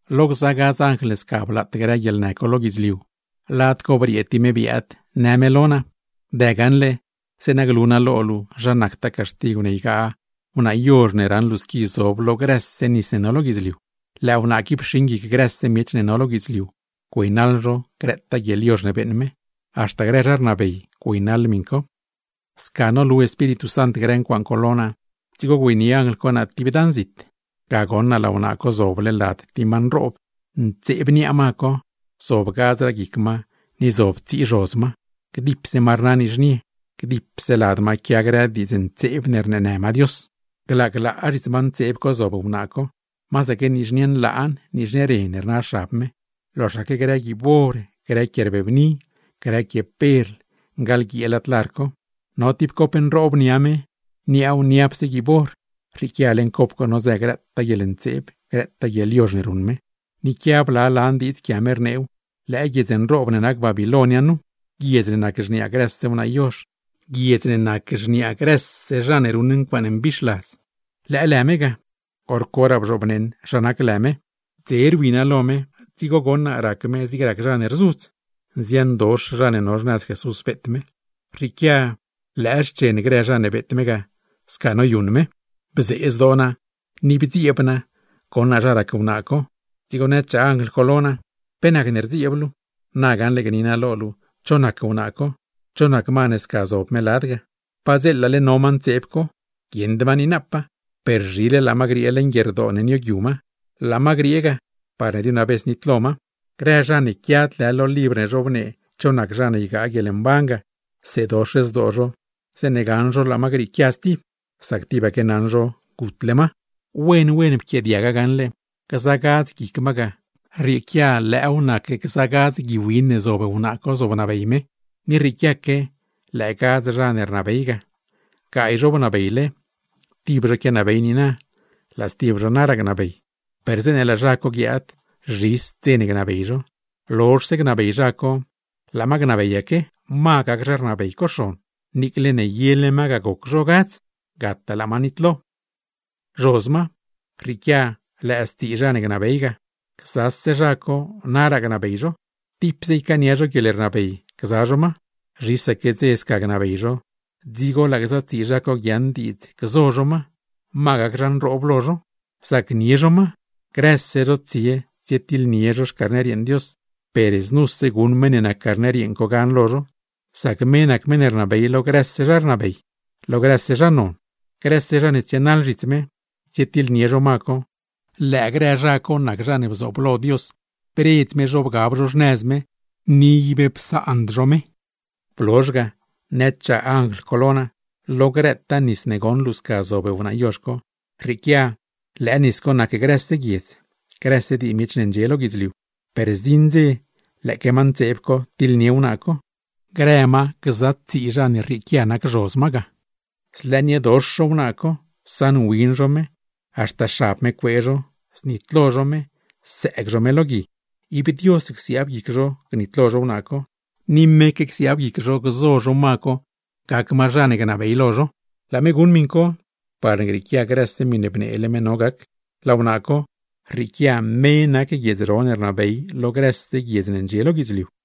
Lo gza gadz anjl ne sca blaat grë guieḻnë co lo guidzliu, lad co briee tib me biaad, në me lo naa: ―Dë gaṉle, zeeṉa glu naa lo luu zha nactaa caxtigw ne ygaa wnaa yozh ne raṉ luu squi zob lo grëse nis ne no lo guidzliu. Lëë wnaa qui pxiṉ guic grëse miech ne no lo guidzliu güeynaḻ zho grëtaa guieḻyozh ne beeṉ me; haxta grë zha rnabey, güeynaḻ miṉ co. Sca nolu Espíritu Sant grë ncuaaṉ co lo naa, dzigo güeynie anjl co naa tib dan zit. Ga goṉ naa laa wnaa co zoble lad tib ma nroob, ntseeb niaa ma co, zob gadzraa guic ma ni zob tsii zhoz ma; gdipse ma rna nizhnie, gdipse lad ma quia grë diidz ntseeb ne rneenë ma Dios. Glaa glaa zhits ma ntseeb co zob wnaa co, masaque nizhnie nlaan, nizhnie ren rna xab me, loxaque grë guiib or, grë quie rbebni, grë quie perl, ngaḻguiee lad lar co. No tib cop nroob niaa me, niaaw niapse guiib or, rrieequia leeṉ co nodzë grëtaa guieḻntseeb, grëtaa guieḻyozh ne ruṉ me. Ni quia bla lan diidz quia me, rneew: “Lëë guiedz nroob ne nac Babiloin nu, guiedz ne nac xniaa grëse wnaa yozh, guiedz ne nac xniaa grëse zha ne ruṉ ncuaaṉe mbixladz.” Lëë lë me ga, hor coraa bzhoobneṉ zha nac lë me. Dze rwi naa lo me, dzigo goṉ naa rac me zig rac zha ne rzudz. Nziandox zha ne no xnëz Jesús beet me, rrieequia grëtaa ren ne pxiee me ga sca noyuṉ me. Bzee zdoo naa, ni bdzieeb naa goṉ naa zha rac wnaa co. Dzigo nëchaa anjl co lo naa: ―¿Pe nacne rdzieeb luu? Na gaṉle gni naa lo luu cho nac wnaa co, cho nac ma ne sca zob me lad ga. Padzeela no ma ntseeb co, guieṉd ma niinapaa, per zhile laa ma griee leṉ guierdoo ne nioogyu ma, laa ma griee ga parne diunavez nitlo ma; grë zha ne quiad lë lo libr ne zhobnee cho nac zha ne ygaa guieḻmban ga, seedox zdoo zho zeeṉe gaṉ zho laa ma grieequia stib, sac tibaque naṉ zho gutle ma. Wen wen pquiaadiaga gaṉle: gza gadz guic ma ga, rrieequia lëëw nac gza gadz gui win ne zob wnaa co zobnabey me. Ni rrieequiaque lëë gadz zha ne rnabey ga: gaay zho bnabeyle, tib zho quianabey niina, laa stib zho naraa gnabey; per zeeṉe laa zha co guiaad, zhis dze ne gnabey zho. Lozhse gnabey zha co, laa ma gnabeyaque, ma gac zha rnabey co xon, niicle ne yele ma ga goc zha co gadz; gataa laa ma nitlo. ’Zhoz ma, rrieequia lëë stsii zha ne gnabey ga, gzase zha co naraa gnabey zho, tipse ycaania zho guieḻrnabey gza zho ma. Zhisaque dze sca gnabey zho, dzigo laa gza tsii zha co guiaaṉ diidz gzo zho ma, ma gac zha nroob lo zho. Zacnie zho ma, grëse zho tsie tsietiḻnie zho Xcarner yeeṉ Dios, per znuse guṉ meṉ ne nac Carner yeeṉ co gan lo zho; sac me nac meṉ ne rnabey lo grëse zha ne rnabey, lo grëse zha ne non. Grëse zha ne tsienaḻ zhits me, tsietiḻnie zho ma co, lëë grë zha co nac zha ne bzooblo Dios bredz me zho bgab zho xnëz me, ni ib psaand zho me. Blozh ga, nëchaa anjl co lo naa: ―Lo grëtaa nis ne goṉ luu sca zob wnaa yozh co, rrieequia lëë nis co nac grëse guiedz, grëse dii miech ne ndxie lo guidzliu. Per zdziṉ dze lëëque ma ntseeb co, tiḻnie wnaa co, grë ma gza tsii zha ne rrieequia nac zhoz ma ga; zlëëniedox zho wnaa co, saṉwin zho me, haxta xab me cuee zho, znitlo zho me, sëëg zho me lo gui. Ib Dios csiaab guic zho gnitlo zho wnaa co, ni meque csiaab guic zho gzo zho ma co gac ma zha ne gnabey lo zho; laa me guṉ miṉ co, parne grieequia grëse miṉe bneele me no gac. Laa wnaa co, rrieequia me nac guiedz ro ne rnabey lo grëse guiedz ne ndxie lo guidzliu.